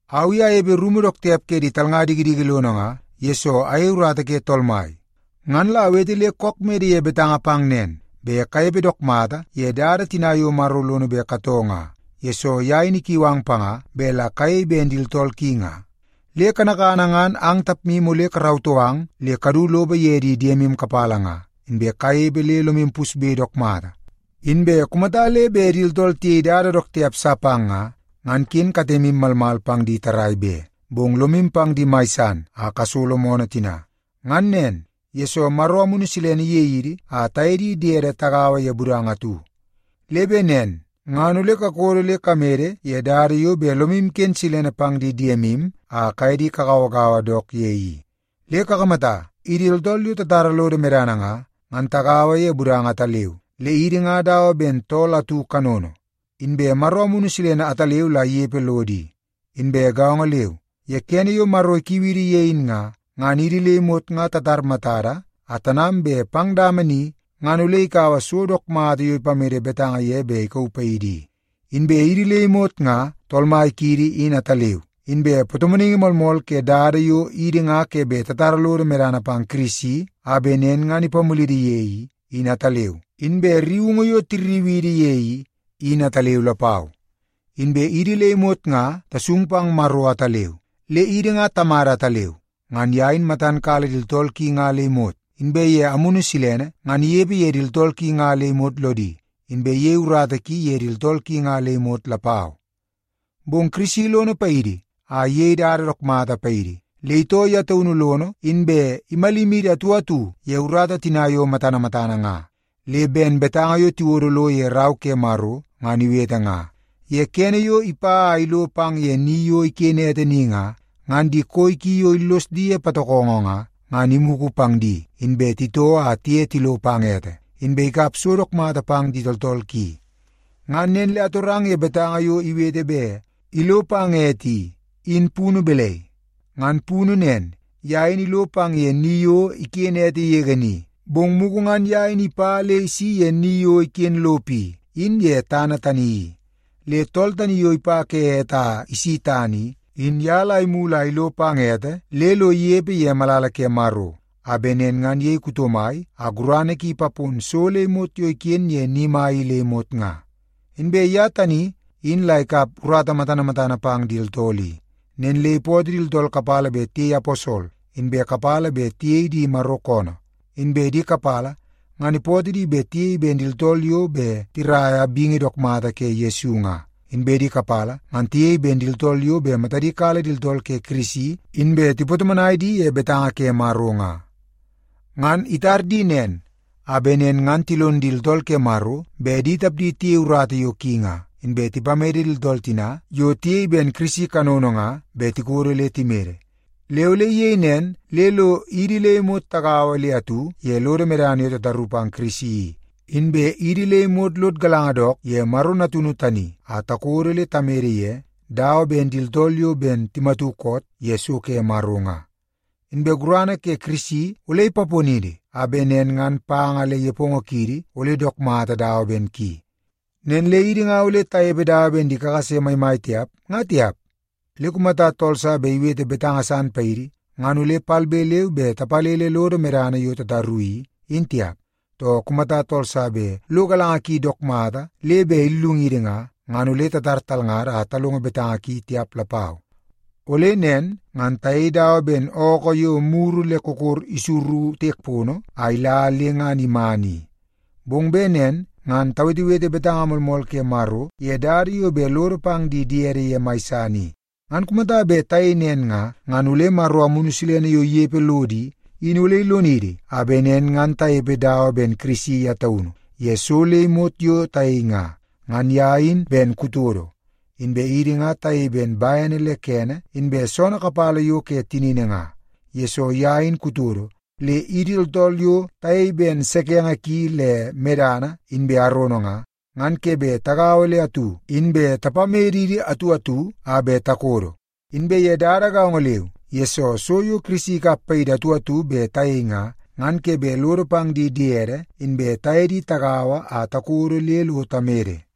Au i anepe rumu dook tiap ke di talnga dikidiki lono nga, yesoo ayei urata ke Tool Mai. Ngan la awete le kook mede ye betanga pang nen, bet kanepe dook mata ye dada tina yo Maro lono bet katoo nga, yesoo ye in ikiu ang panga bet la kayei ben di tooltool ki nga. Le kanakana ngan ang tapmu ole karautoo ang le kadu lopo ye di diemu kapala nga, inbe kanepe le lomu pusbe dook mata. Inbe kumata le bet di tooltool tiyei dada dook tiap sa pang nga, ngan ken katemu malmal pang di tarrai be, bong lomu pang di mai san a kasolo moonoo tina. Ngan nen, yesoo Maro Amunu Silene iyei idi a taye di diede tagaua ye budanga atu. Le bet nen ngan ole kakodo le kamede ye dada yo bet lomu iken silene pang di diemu a kaye di kagauagaua dook ye i. Le kakamata, idi tooltool yo tatara lodo medana nga, ngan tagaua ye budanga ataleu, le idi ngan dawa ben tool atu kanono. Inbe Maro Amunu Silene ataleu la inepe lodo i. Inbe gaongo leu, ye kene yo Maro ikiu idi ye in nga, ngan idi le imot nga tatar matada a tanam bet pang dama ni, ngan ole ikaua so dook mata yo ipamede betanga ye bet ikauu paidi i. Inbe idi le imot nga Tool Mai kiidi in ataleu, inbe patomonaingi moolmool ke dada yo idi nga ke bet tatara lodo medana pang Kirisi a bet nen ngan ipamulidi ye i, in ataleu, inbe rriungu yo tirriu idi ye i, in ataleu lapau. Inbe idi le imot nga tasung pang Maro ataleu, le idi nga Tamada ataleu. Ngan ye in matan kala di tooltool ki nga le imot, inbe ye Amunu Silene ngan inepe ye di tooltool ki nga le imot lodi, inbe iyei urata ki ye di tooltool ki nga le imot lapau. Bong Kirisi lono paidi a iyei dada dook mata paidi, le itoo ye taunu lono inbe imalimidi atu atu ye urata tina yo matana matana nga. Le ben betanga yo tiwodo lo ye Rau ke Maro ngan iwete nga, “Ye kene yo ipa a ilo pang ye ni yo iken ete ni nga, ngan di koi ki yo illos di ye patokongo nga, ngan imugu pang di, inbe titoo a tiye tilo pang ete, inbe ikap so dook mata pang di tooltool ki.” Ngan nen le atorang ye betanga yo iwete bet “ilo pang ete” i, in punu balai? Ngan punu nen, ye in ilo pang ye ni yo iken ete yege ni, bong mugu ngan ye in ipa le isi ye ni yo iken lopo i, in ye tana tani i. Le tool tani yo ipa ke ete a isi tana i, in ye la imulu a ilo pang ete le lo inepe ye malala ke Maro, a bet nen ngan iyei kuto mai a gurana ki ipapon so le imot yo iken ye ni mai i le imot nga. Inbe ye tani in la ikap urata matana matana pang di tooltool i. Nen le ipootoo di tooltool kapala bet tiyei aposol, inbe kapala bet tiyei di Maro koonoo. Inbe di kapala ngan ipootoo di bet tiyei ben di tooltool yo bet tiraia bingi dook mata ke Yesu nga, inbe di kapala ngan tiyei ben di tooltool yo bet matadi kala di tooltool ke Kirisi inbe tipatomonai di ye betanga ke Maro nga. Ngan itar di nen a bet nen ngan tilon di tooltool ke Maro bet di tapdi tiyei urata yo ki nga, inbe tipamede di tooltool tina yo tiyei ben Kirisi kanono nga bet tikodo le timede. Le ole iyei nen le lo idi le imot tagaua le atu ye lodo medana yo tataru pang Kirisi i, inbe idi le imot lod galanga dook ye Maro Natunu tani a takodo le tamede ye, dawa ben di tooltool yo ben timatu koot ye so ke Maro nga. Inbe gurana ke Kirisi ole ipaponidi a bet nen ngan panga le nepongo kiidi ole dook mata dawa ben ki. Nen le idi nga ole tanepe dawa ben di kakase maimai tiap, nga tiap. Le kumata tool sa bet iwete betanga san paidi, ngan ole palbe leu be tapalele lodo medana yo tataru i, in tiap. Too, kumata tool sa bet lo galanga ki dook mata le bet illungidi nga, ngan ole tatar talngada a talongo betanga ki tiap lapau. Ole nen ngan tayei dawa ben ookoo yo muru le kokor isuru tiek pono a ila le ngan iman i. Bong bet nen ngan tawetewete betanga moolmool ke Maro ye dada yo bet lodo pang di diede ye mai san i. Ngan kumata bet tayei nen nga, ngan ole Maro Amunu Silene yo inepe lodo i, in ole ilonidi a bet nen ngan tanepe dawa ben Kirisi ye taunu ye so le imot yo tayei nga. Ngan ye in ben kutodo, inbe idi nga tayei ben bene le kene inbe soonoo kapala yo ke tinini nga. Yesoo ye in kutodo, le idi tooltool yo tayei ben sekenge ki le medana inbe arono nga, ngan ke bet tagaua le atu inbe tapamedidi atu atu a bet takodo. Inbe ye dada gaongo leu, yesoo so yo Kirisi ikap paidi atu atu bet tayei nga, ngan ke bet lodo pang di diede inbe taye di tagaua a takodo le lo tamede.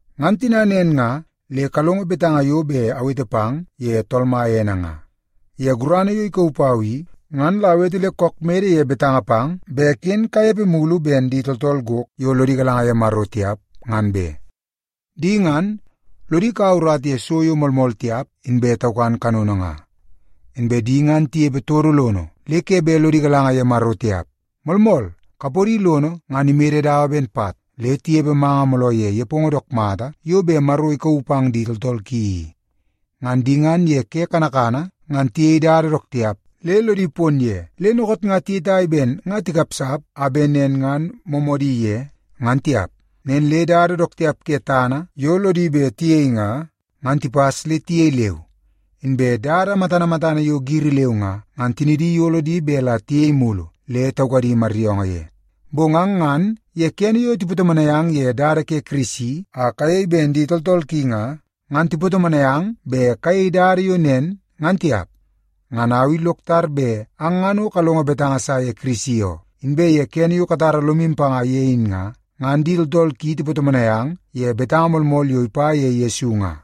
Ngan tina nen nga, le kalongo betanga yo bet awete pang ye Tool Mai ene nga! Ye gurana yo ikauu pau i, ngan la awete le kook mede ye betanga pang bet ken kanepe mulu ben di tooltool gok yo lodi galanga ye Maro tiap, ngan be. Di ngan, lodi kaua urata ye so yo moolmool tiap inbe taukan kanono nga. Inbe di ngan tinepe todo lono le ke bet lodi galanga ye Maro tiap. Moolmool, kapodi lono ngan imede dawa ben pat, le tinepe manga mooloo ye nepongo dook mata yo bet Maro ikauu pang di tooltool ki i. Ngan di ngan ye ke kanakana ngan tiyei dada dook tiap le lodi pon ye, le dookoot nga tiyetai ben nga tikapsap a bet nen ngan moomoodi ye, ngan tiap. Nen le dada dook tiap ke tana yo lodi bet tiyei nga, ngan tipas le tiyei leu. Inbe dada matana matana yo giri leu nga, ngan tinidi iyolo di bet la tiyei mulu le taukadi maryoongoo ye. Bong ang ngan ye kene yo tipatomonai ang ye dada ke Kirisi a kayei ben di tooltool ki nga, ngan tipatomonai ang bet kayei dada yo nen ngan tiap. Ngan au i lok tar bet ang ngan o kalongo betanga sa ye Kirisi oo, inbe ye kene yo katara lomu panga ye in nga, ngan di tooltool ki tipatomonai ang ye betanga moolmool yo ipa ye Yesu nga.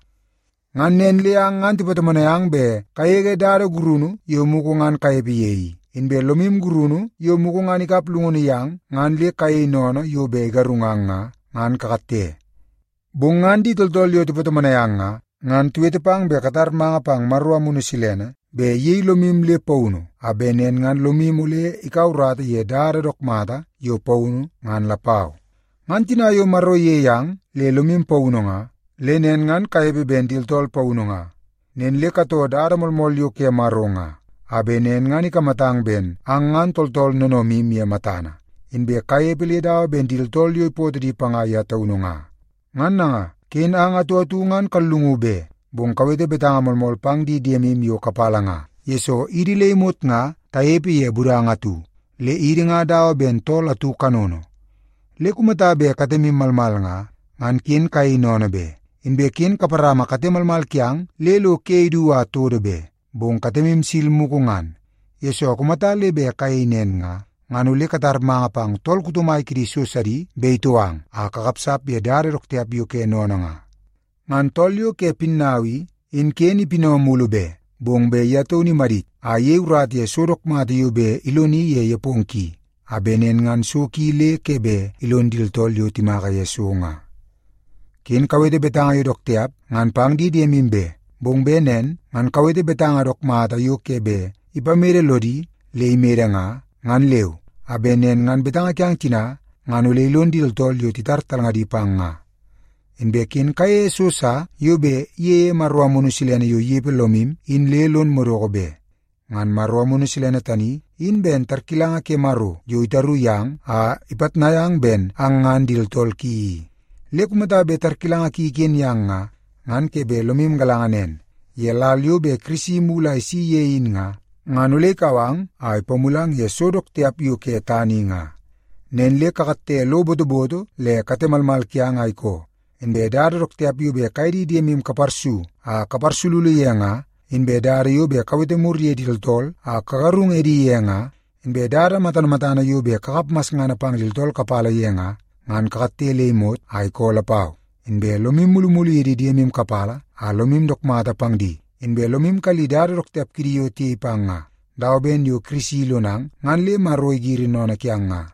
Ngan nen le ang ngan tipatomonai ang bet kagege dada gurunu yo mugu ngan kanepe ye i, inbe lomu gurunu yo mugu ngan ikap llungunu yang ngan le kayei sennene yo bet igarungang nga, ngan kakatte. Bong ngan di tooltool yo tipatomonai ang nga, ngan tiwete pang bet katar manga pang Maro Amunu Silene bet iyei lomu le paunu a bet nen ngan lomu ole ikaua urata ye dada dook mata yo paunu ngan lapau. Ngan tina yo Maro iyei ang le lomu paunu nga, le nen ngan kanepe ben di tooltool paunu nga. Nen le katoo dada moolmool yo ke Maro nga, a bet nen ngan ikamatang ben ang ngan tooltool noonoomu ye matana, inbe kanepe le dawa ben di tooltool yo ipootoo di panga ye taunu nga. Ngan nanga, ken ang atu atu ngan kallungu be, bong kawete betanga moolmool pang di diemu yo kapala nga, yesoo idi le imot nga tanepe ye budanga atu, le idi nga dawa ben tool atu kanono. Le kumata bet katemu malmal nga, ngan ken kayei sennene be. Inbe ken kaparama kate malmal kiang le lo ke idu a todo be, bong katemu sil mugu ngan, yesoo kumata le bet kayei nen nga, ngan ole katar manga pang tool kuto mai kidi so sidi bet itou ang a kakapsap ye dada dook tiap yo ke sennene nga. Ngan tool yo ke pinnau i, in ken ipinau mulu be, bong bet ye taunu imadit a iyei urata ye so dook mata yo bet iloni ye nepongo ki, a bet nen ngan so ki le ke bet ilon di tooltool yo timaka ye so nga. Ken kawete betanga yo dook tiap ngan pang di diemu be, bong bet nen ngan kawete betanga dook mata yo ke bet ipamede lodi le imede nga, ngan leu, a bet nen ngan betanga kiang tina ngan ole ilon di tooltool yo titar talngadi pang nga. Inbe ken kayeie so sa yo bet iyeie Maro Amunu Silene yo inepe lomu in le lon madoko be. Ngan Maro Amunu Silene tani, in ben tarkilanga ke Maro yo itaru yang a ipitnai ang ben ang ngan di tooltool ki i. Le kumata bet tarkilanga ki iken yang nga, ngan ke bet lomu galanga nen, ye lal yo bet Kirisi imulu a isi ye in nga, ngan ole ikau ang a ipamulang ye so dook tiap yo ke tana i nga. Nen le kakatte lo botoboto le kate malmal kiang a ikoo. Inbe dada dook tiap yo bet kaye di diemu kaparsu a kaparsululu ye nga, inbe dada yo bet kawete mur ye di tooltool a kagarung edi ye nga, inbe dada matana matana yo bet kakap masngana pang di tooltool kapala ye nga, ngan kakatte le imot a ikoo lapau. Inbe lomu mulumulu ye di diemu kapala a lomu dook mata pang di, inbe lomu kalli dada dook tiap kidi yo tiyei pang nga, dawa ben yo Kirisi ilonang ngan le Maro igiri sennene kiang nga.